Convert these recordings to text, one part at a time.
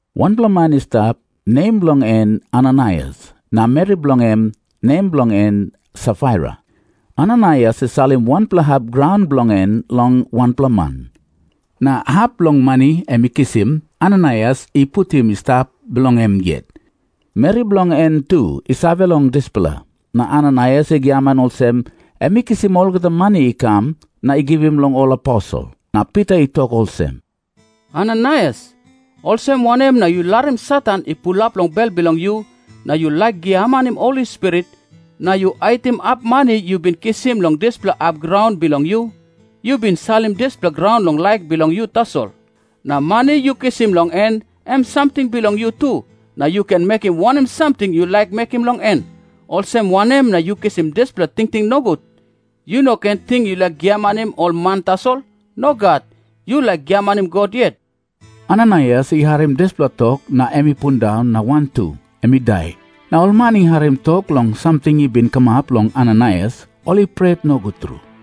Wanpela man i stap, nem bilong en Ananaias, na meri bilong em, nem bilong en Safaira. Ananaias i salim wanpela hap graun bilong en long wanpela man. Na hap bilong mani em i kisim, Ananaias i putim i stap bilong em yet. Meri bilong en tu i save long dispela. Na Ananaias i giaman olsem em i kisim olgeta mani i kam na i givim long ol aposel. Na Pita i tok olsem, “Ananaias, olsem wanem na yu larim Satan i pulap long bel bilong yu, na yu laik giamanim Holi Spirit, na yu haitim hap mani yu bin kisim long dispela hap graun bilong yu? Yu bin salim dispela graun long laik bilong yu tasol. Na mani yu kisim long en, em samting bilong yu tu, na yu ken mekim wanem samting yu laik mekim long en. Olsem wanem na yu kisim dispela tingting nogut? Yu no ken ting yu laik giamanim ol man tasol. Nogat. Yu laik giamanim God yet.” Ananaias i harim dispela tok na em i pundaun na wantu em i dai. Na ol man i harim tok long samting i bin kamap long Ananaias, ol i pret nogut tru.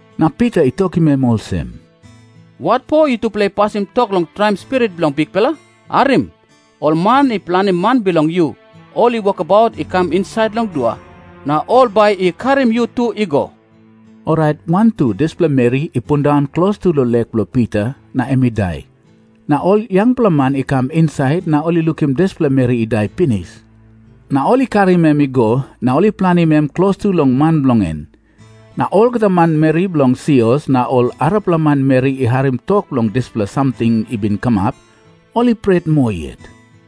Na Pita i tokim em olsem, “Watpo yutupela i pasim tok long traim Spirit bilong Bikpela? Harim. Ol man i planim man bilong yu, ol i wokabaut i kam insait long dua. Na ol bai i karim yu tu i go.” Orait wantu dispela meri i pundaun klostu long lek bilong Pita na em i dai. Na ol yangpela man i kam insait, na ol i lukim dispela meri i dai pinis. Na ol i karim em i go, na ol i planim em klostu long man bilong en. Na olgeta manmeri bilong sios na ol arapela manmeri i harim tok long dispela samting i bin kamap, ol i pret moa yet.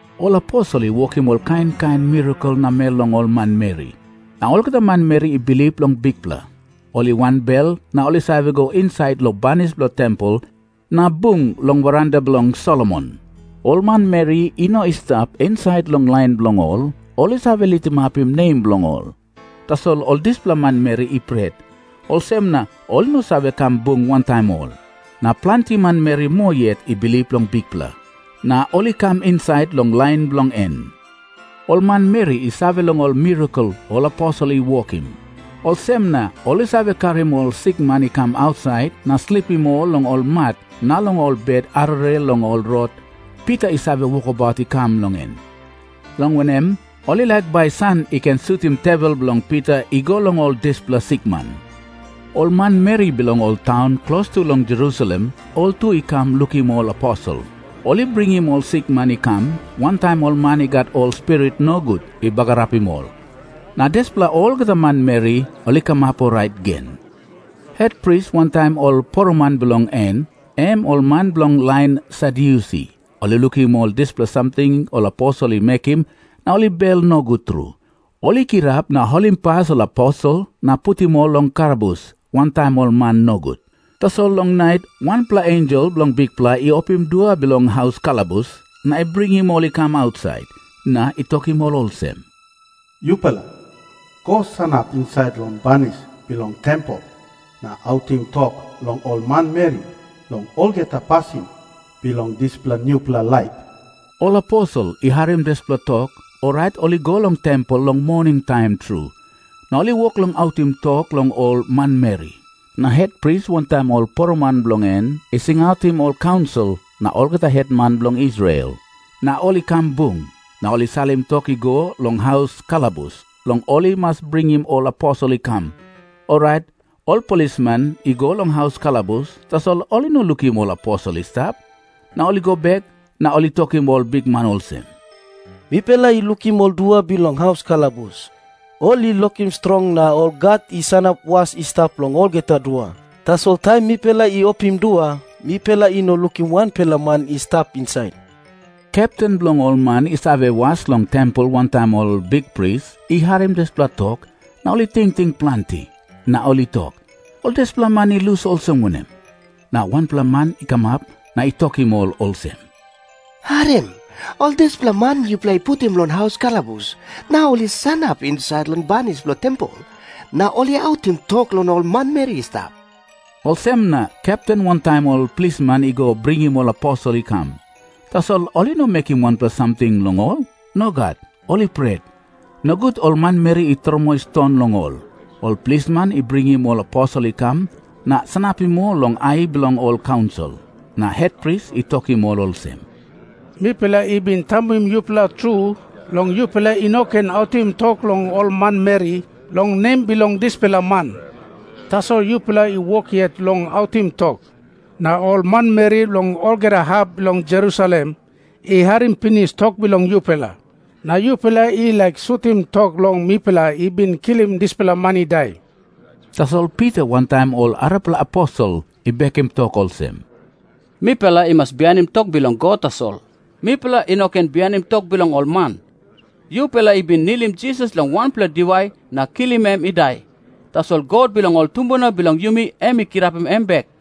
Ol aposel i wokim ol kain kain mirakel namel long ol manmeri. Na olgeta manmeri i bilip long Bikpela, ol i wanbel na ol i save go insait long banis bilong tempel, na bung long veranda bilong Solomon. Ol manmeri i no i stap insait long lain bilong ol, ol i save litimapim nem bilong ol. Tasol ol dispela manmeri i pret, olsem na ol i no save kam bung wantaim ol. Na planti manmeri moa yet i bilip long Bikpela, na ol i kam insait long lain bilong en. Ol manmeri i save long ol mirakel ol aposel i wokim. Olsem na ol i save karim ol sikman i kam ausait na slipim ol long ol mat na long ol bet arere long ol rot Pita i save wokabaut i kam long en, long wanem, ol i laik bai san i ken sutim tewel bilong Pita i go long ol dispela sikman. Ol manmeri bilong ol taun klostu long Jerusalem, ol tu i kam lukim ol aposel. Ol i bringim ol sikman i kam, wantaim ol man i gat ol spirit nogut i bagarapim ol. Na dispela olgeta manmeri ol i kamap orait gen. Hetpris wantaim ol poroman bilong en, em ol man bilong lain Sadyusi, ol i lukim ol dispela samting ol aposel i mekim na ol i bel nogut tru. Ol i kirap na holimpas ol aposel na putim ol long kalabus wantaim ol man nogut. Tasol long nait wanpela ensel bilong Bikpela i opim dua bilong haus kalabus na i bringim ol i kam ausait, na i tokim ol olsem, “Yupela go sanap insait long banis bilong tempel na autim tok long ol manmeri long olgeta pasin bilong dispela nupela laip.” Ol aposel i harim dispela tok, orait ol i go long tempel long moningtaim tru, na ol i wok long autim tok long ol manmeri. Na hetpris wantaim ol poroman bilong en i singautim ol kaunsil na olgeta hetman bilong Israel, na ol i kam bung. Na ol i salim tok i go long haus kalabus, long ol i mas bringim ol aposel i kam. Orait ol plisman i go long haus kalabus, tasol ol i no lukim ol aposel i stap. Na ol i go bek na ol i tokim ol bikman olsem, “Mipela i lukim ol dua bilong haus kalabus, ol i lokim strong na ol gat i sanap was i stap long olgeta dua. Tasol taim mipela i opim dua, mipela i no lukim wanpela man i stap insait.” Kepten bilong ol man i save was long tempel wantaim ol bikpris i harim dispela tok, na ol i tingting planti, na ol i tok, “Ol dispela man i lus olsem wanem?” Na wanpela man i kamap na i tokim ol olsem, “Harim. Ol dispela man yupela i putim long haus kalabus, nau ol i sanap insait long banis bilong tempel na ol i autim tok long ol manmeri i stap.” Olsem na kepten wantaim ol plisman i go bringim ol aposel i kam. Tasol ol i no mekim wanpela samting long ol. Nogat. Ol i pret, nogut ol manmeri i tromoi ston long ol. Ol plisman i bringim ol aposel i kam na sanapim ol long ai bilong ol kaunsil. Na hetpris i tokim ol olsem, “Mipela i bin tambuim yupela tru long yupela i no ken autim tok long ol manmeri long nem bilong dispela man. Tasol yupela i wok yet long autim tok, na ol manmeri long olgeta hap bilong Jerusalem i harim pinis tok bilong yupela. Na yupela i laik sutim tok long mipela i bin kilim dispela man i dai.” Tasol Pita wantaim ol arapela aposel i bekim tok olsem, “Mipela i mas bihainim tok bilong God tasol. Mipela i no ken bihainim tok bilong ol man. Yupela i bin nilim Jisas long wanpela diwai na kilim em i dai, tasol God bilong ol tumbuna bilong yumi em i kirapim em bek.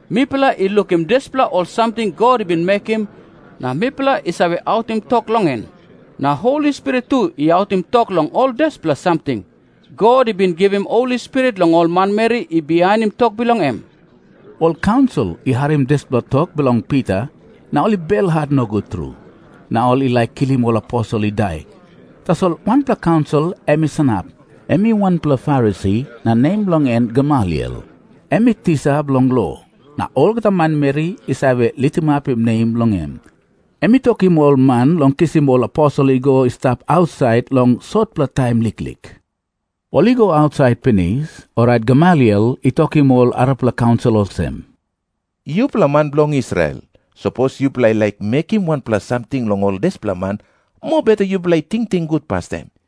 Mipela i lukim dispela ol samting God i bin mekim, na mipela i save autim tok long en. Na Holi Spirit tu i autim tok long ol dispela samting. God i bin givim Holi Spirit long ol manmeri i bihainim tok bilong em.” Ol kaunsil i harim dispela tok bilong Pita, na ol i belhat nogut tru, na ol i laik kilim ol aposel i dai. Tasol wanpela kaunsil em i sanap. Em i wanpela Farisi, na nem bilong en Gamaliel. Em i tisa bilong lo, na olgeta manmeri i save litimapim nem bilong em. Em i tokim ol man long kisim ol aposel i go i stap ausait long sotpela taim liklik. Ol i go ausait pinis, orait Gamaliel i tokim ol arapela kaunsil olsem, “Yupela man bilong Israel, sapos yupela i laik mekim wanpela samting long ol dispela man, mobeta yupela i tingting gut pastaim.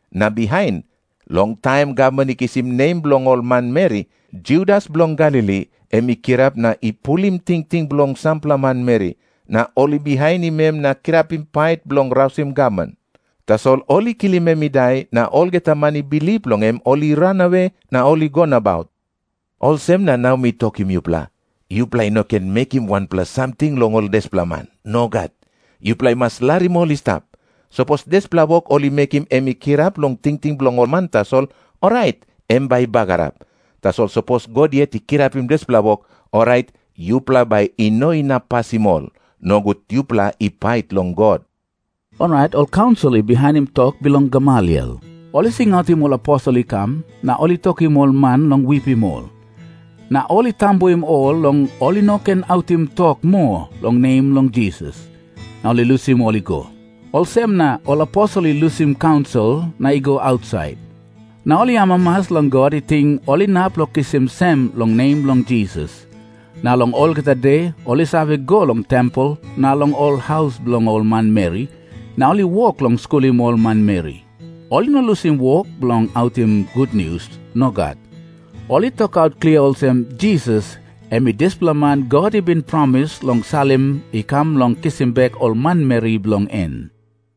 Na bihain, long taim gavman i kisim nem bilong ol manmeri, Judas bilong Galili em i kirap na i pulim tingting bilong sampela manmeri. Na ol i bihainim em na kirapim pait bilong rausim gavman. Tasol ol i kilim em i dai, na olgeta man i bilip long em ol i ranawe na ol i go nabaut. Olsem na nau mi tokim yupela, yupela i no ken mekim wanpela samting long ol dispela man. Nogat. Yupela i mas larim ol i stap. Sapos dispela wok ol i mekim em i kirap long tingting bilong ol man tasol, orait em bai i bagarap. Tasol sapos God yet i kirapim dispela wok, orait yupela bai i no inap pasim ol. Nogut yupela i pait long God!” Orait ol kaunsil i bihainim tok bilong Gamaliel. Ol i singautim ol aposel i kam, na ol i tokim ol man long wipim ol. Na ol i tambuim ol long ol i no ken autim tok moa long nem bilong Jisas. Na ol i lusim ol i go. Olsem na ol aposel i lusim kaunsil na i go ausait. Na ol i amamas long God i ting ol inap long kisim sem long nem bilong Jisas. Na long olgeta de, ol i save go long tempel na long ol haus bilong ol manmeri, na ol i wok long skulim ol manmeri. Ol i no lusim wok bilong autim gutnius. Nogat. Ol i tokaut klia olsem, Jisas em i dispela man God i bin promis long salim i kam bilong kisim bek ol manmeri bilong en.